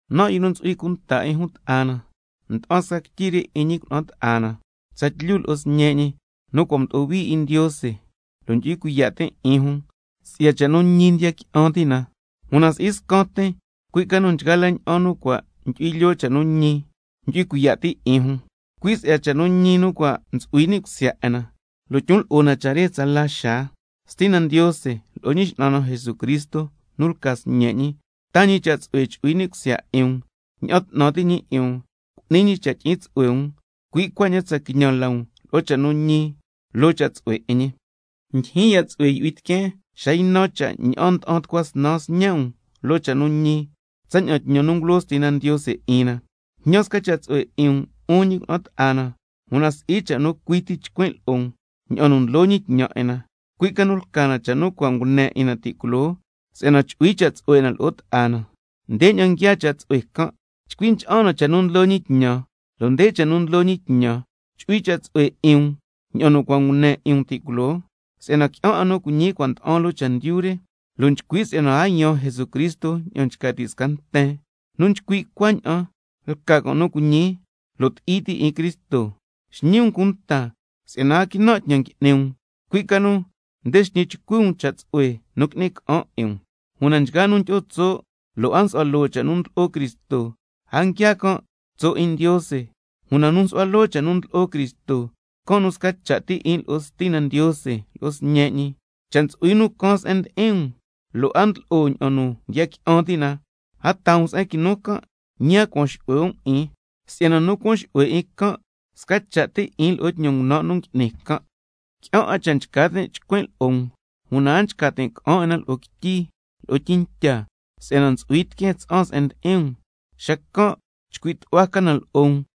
Nan', yu nu ntsu'hui cunta 'in jun ta'a na, nda'an sca quityi re 'in ñi cuna'an ta'a na tsatlyu lo'o sñe' ñi, nu cua' mdo'o hui 'in Ndiose, lo' ndyu'hui cuiya' tin' 'in jun si'ya cha' nu ñi ndiya qui'an ti' na. Una si'i scan tin, cui' ca nu nchgaa la ña'an nu cua' ndyu'hui lyoo cha' nu ñi, ndyu'hui cuiya' ti' 'in jun. Cui' si'ya cha' nu ñi nu cua' ntsu'hui ni' cusya 'in na, lo' ntsu'hui na 'in na tsala xaa. Stina Ndiose lo'o Ñi X'nan na Jesucristo nu lca Sñe' ñi, taa ñi cha' tsu'hue chu'hui ni' cusya 'in um, ña'an 'tnan ti' ñi 'in um, cu'ni ñi cha' tyi'in tsu'hue um, cui' cuaña'an tsa quiñan la um lo'o cha' nu ñi lo'o cha' tsu'hue 'in ñi. Ndyijyin ya' tsu'hue yu'hui tiqueen xa ynan cha' ña'an nda'an tucua snan sñe' um loo cha' nu ñi, tsaña'an tñan nu ngulo Stina Ndiose 'in na. Jñan sca cha' tsu'hue 'in um, 'un ñi cuna'an ta'a na, una si'i cha' nu cui ti nchcuin' lo'o um ña'an nu ndlo ñi tñan 'in na, cui' ca nu lca na cha' nu cua' ngune 'in na ti' culoo, si'yana chu'hui cha' tsu'hue 'in na lo'o ta'a na. Ndeña'an nguiaa cha' tsu'hue can', chcui ncha'an na cha' nu ndlo ñi tñan. Lo' nde cha nu ndlo ñi tñan: Chu'hui cha' tsu'hue 'in um ña'an nu cua' ngune 'in um ti' culoo. Si'yana qui'an 'a nu cuiñi nu cua' nda'an loo chendyu re, lo' nchcui' si'yana a yaan Jesucristo ña'an nchca ti' sca nten. Nu nchcui' cuaña'an lca can' nu cuiñi lo' ti'i ti' 'in Cristo. Xñi um cunta si'yana a quinan' tñan ngui'ni um, cui' ca nu nde xñi chcui um cha' tsu'hue nu qui'ni ca'an 'in um. Una nchgaa nu tyi'o tso' lo' a nsu'hua loo cha' nu ndlo'o Cristo, a nguiaa can' tso' 'in Ndiose. Una nu nsu'hua loo cha' nu ndlo'o Cristo, can' nu sca cha' ti 'in lo'o Stina Ndiose lo'o Sñe' ñi. Cha' ntsu'hui nu caan se'en ndi'in um, lo' a ndlo'o ña'an cha' nu ndiya qui'an ti' na, a taa um se'en quinu can', ñi a cuan xu'hue um 'in. Si'yana nu cuan xu'hue 'in can', sca cha' ti 'in lo'o tñan ngunan' nu ngui'ni can'. Qui'an 'a cha' nchca tin' chcuin' lo'o um, una a nchca tin' ca'an 'in na loo quityi lo'o tyintya, si'yana ntsu'hui tiqueen tsa'an se'en ndi'in um, xacan' ycuin' can chcuin' lo'o um.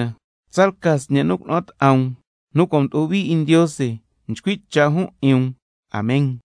Tsalca sñe' nu cuna'an ta'a um, nu cua' mdo'o hui 'in Ndiose, nchcui' cha' jun 'in um. Amen.